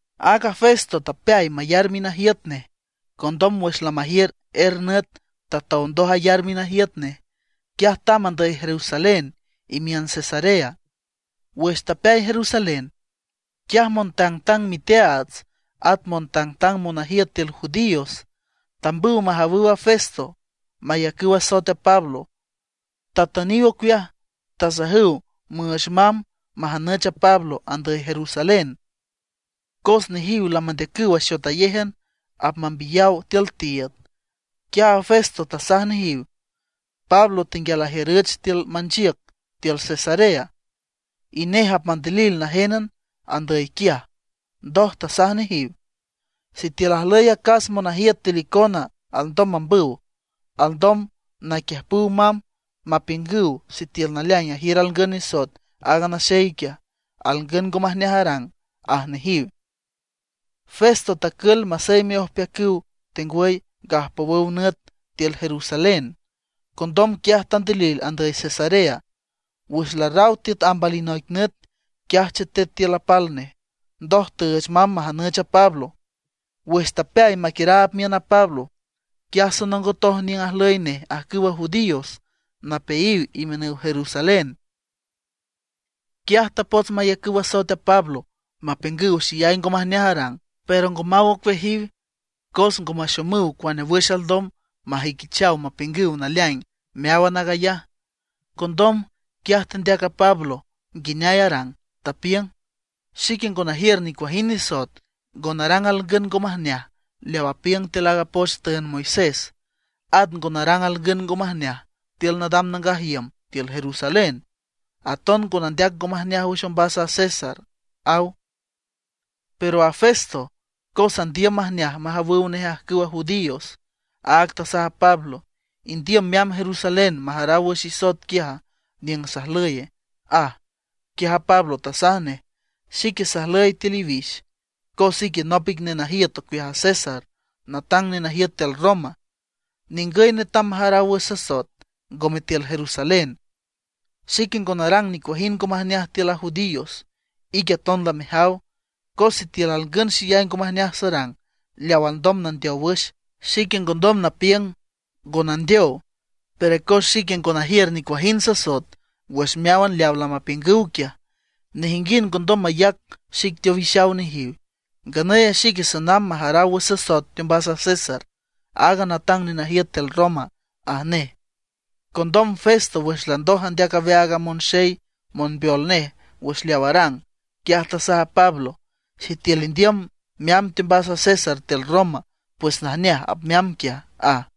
Aaga Festo tapeay mayar minajiüt nej. Condom wüx lamajiür er nüt tatow ndoj ayar minajiüt nej, quiaj tamb andüy Jerusalén imiün Cesarea. Wüx tapeay Jerusalén, quiaj montangtang miteaats at montangtang monajiüt tiül judíos tambüw majawüw a Festo, mayacüw asoet a Pablo. Tatüniw ocueaj, tasajüw müüch mamb majanüch a Pablo andüy Jerusalén. Cos nejiw lamandeacüw axotayéjan apmambiyaw tiül tiiüd. Quiaj a Festo tasaj nejiw, Pablo tenguial ajiürüch tiül manchiüc tiül Cesarea, y nej apmandilil najénan andüy quiaj. Ndoj tasaj nejiw: ―Sitiül ajlüy acas monajiüt tiül icona alndom mambüw, alndom naquiüjpüw mamb mapiüngüw sitiül naleaing ajiür alngün nisoet aaga naxey quiaj, alngün ngo majneaj arang ―aj nejiw. Festo tacül maseyme ojpeacüw tengwüy gajpowüw nüt tiül Jerusalén, condom quiaj tandilil andüy Cesarea. Wüx larraw tiüt amb alinoic nüt, quiaj chetet tiül apal nej. Ndoj tüüch mamb majanüch a Pablo. Wüx tapeay maquiüraab miün a Pablo, quiaj sonongotoj niüng ajlüy nej ajcüwa judíos napeayiw imiünüw Jerusalén. Quiaj tapots mayacüw asoet a Pablo, mapiüngüw xeyay ngo majneaj arang. Pero ngo maw ocueajiw, cos ngo maxomüw cuane wüx alndom majüiquichaw mapiüngüw naleaing meáwan aag ayaj. Condom, quiaj tandeac a Pablo nguineay arang, tapiüng: ―Xique ngo najiür nicuajind nisoet, ngo narang alngün ngo majneaj leaw apiüng tiül aaga poch tüünd Moisés. At ngo narang alngün ngo majneaj tiül nadam nangaj iüm tiül Jerusalén. Aton ngo nandeac ngo majneaj wüx ombas a César ―aw. Pero a Festo, cos andiüm majneaj majawüw nej ajcüwa judíos, áag tasaj a Pablo: ―¿Indiüm meamb Jerusalén, majaraw wüx isoet quiaj niüng sajlüye? ―aj. Quiaj a Pablo tasaj nej: ―Xique sajlüy tiül iwix, cos ique nop ic nenajiüt ocueaj a César natang nenajiüt tiül Roma. Ningüy netam majaraw wüx sasoet, ngome tiül Jerusalén. Xique ngo narang nicuajind ngo majneaj tiül a judíos, ique aton lamejaw. Cos sitiül alngün xeyay ngo majneaj sarang, leaw alndom nandeow wüx, xique ngondom napiüng ngo nandeow. Pero cos xique ngo najiür nicuajind sasoet wüx meáwan leaw lamapiüngüw quiaj, nejinguind ngondom mayac xic teowixaw nejiw. Nganüy a xique sanamb majaraw wüx sasoet teombas a César, aaga natang nenajiüt tiül Roma ―aj nej. Condom Festo wüx landoj andeac aweaag a monxey monbeol nej wüx leaw arang, quiaj tasaj a Pablo: ―Sitiül indiüm meamb teombas a César tiül Roma, pues najneaj, apmeamb quiaj ―aj.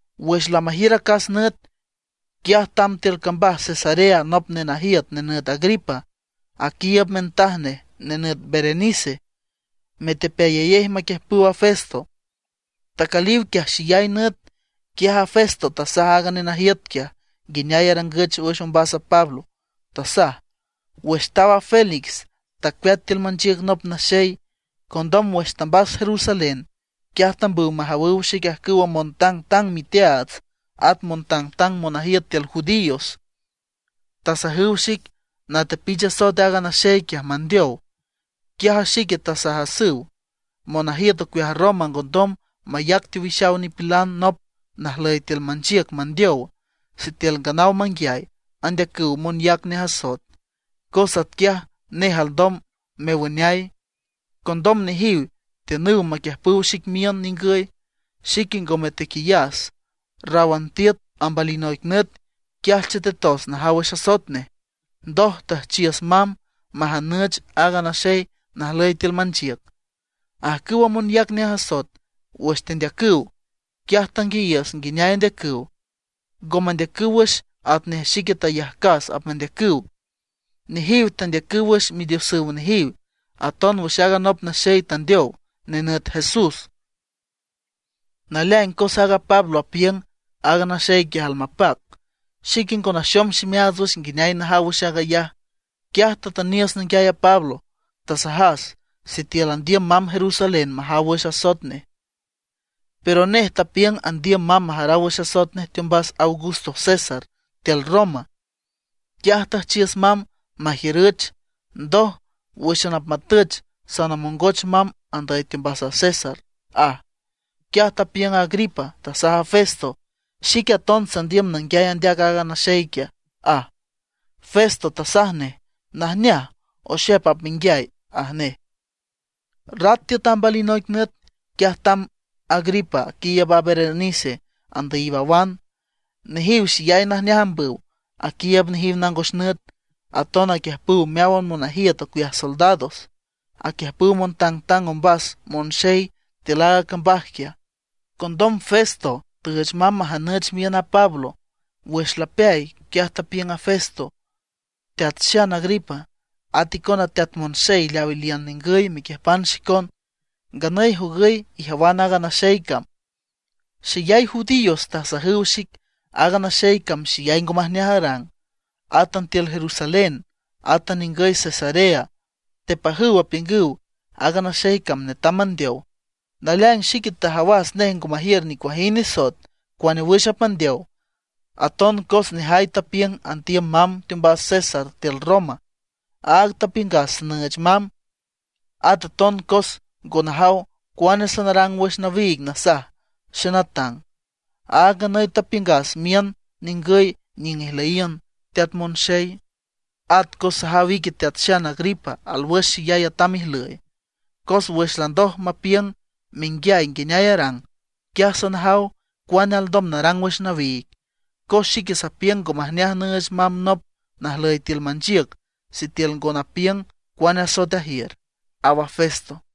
Wüx lamajiür acas nüt, quiaj tamb tiül cambaj Cesarea nop nenajiüt nenüt Agripa, aquiiüb mintaj nej nenüt Berenice, metepeayayej maquiüjpüw a Festo. Tacüliw quiaj xeyay nüt, quiaj a Festo tasaj aaga nenajiüt quiaj nguineay arangüch wüx ombas a Pablo, tasaj: ―Wüx taw a Félix, tacueat tiül manchiüc nop naxey. Condom wüx tambas Jerusalén, quiaj tambüw majawüw xic ajcüwa montangtang miteaats at montangtang monajiüt tiül judíos. Tasajüw xic natepich asoet aaga naxey quiaj, mandeow. Quiaj a xique tasajasüw, monajiüt ocueaj Roma ngondom mayac teowixaw nipilan nop najlüy tiül manchiüc mandeow sitiül nganaw manguiay andeacüw monyac nej asoet, cos atquiaj nej alndom mewüneay. Condom nejiw tiünüw maquiüjpüw xic miün ningüy. Xique ngome tequiyas; ráwan tiüt amb alinoic nüt, quiaj chetetos najaw wüx asoet nej. Ndoj tüjchiüs mamb majanüch aaga naxey najlüy tiül manchiüc. Ajcüwa monyac nej asoet, wüx tendeacüw, quiaj tanguiayiüs nguineay andeacüw. Ngo mandeacüw wüx atnej xique tayajcas apmandeacüw. Nejiw tandeacüw wüx midiosüw nejiw, aton wüx aaga nop naxey tandeow, nenüt Jesús. Naleaing cos a Pablo apiüng aaga naxey quiaj almapac. Xique ngo naxom ximeaats nguineay najaw wüx aag ayaj, quiaj tatüniüs nanguiay a Pablo. Tasajas sitiül andiüm mamb Jerusalén majaw wüx asoet nej. Pero nej tapiüng andiüm mamb majaraw wüx asoet nej teombas Augusto César tiül Roma, quiaj tüjchiüs mamb majiürüch; ndoj, wǘxan apmatüch sanamongoch mamb andüy teombas a César ―aj. Quiaj tapiüng Agripa, tasaj a Festo: ―Xique aton sandiüm nanguiay andeac aaga naxey quiaj ―aj. Festo tasaj nej: ―Najneaj, oxep apmenguiay ―aj nej. Rat tiüt amb alinoic nüt, quiaj tamb Agripa aquiiüb a Berenice andüyiw awan. Nejiw xeyay najneaj ambüw, aquiiüb nejiw nangos nüt. Aton aquiüjpüw meáwan monajiüt ocueaj soldados, aquiüjpüw montangtang ombas monxey tiül aaga cambaj quiaj. Condom Festo tüüch mamb majanüch miün a Pablo. Wüx lapeay, quiaj tapiüng a Festo: ―Teat Xan Agripa, at icona teat monxey leaw iliünan ningüy mequiüjpan xicon, nganüy jogüy ijawan aaga naxey cam. Xeyay judíos tasajüw xic aaga naxey cam xeyay ngo majneaj arang. Átan tiül Jerusalén, átan ningüy Cesarea, tepajüw apiüngüw aaga naxey cam netam mandeow. Naleaing xique tajawas nej ngo majiür nicuajind nisoet cuane wüx apmandeow, aton cos nejay tapiüng andiüm mamb teombas César tiül Roma; áag tapiüngas sanüüch mamb. At aton cos ngo najaw cuane sanarang wüx nawiig nasaj xenatang, áag nganüy tapiüngas miün ningüy niüng ijlüyiün, teat monxey. At cos sajaw ique Teat Xan Agripa alwüx xeyay atam ijlüy. Cos wüx landoj mapiüng menguiay nguineay arang, quiaj sanajaw cuane alndom narang wüx nawiig. Cos xique sapiüng ngo majneaj nüüch mamb nop najlüy tiül manchiüc sitiül ngo napiüng cuane asoet ajiür ―aw a Festo.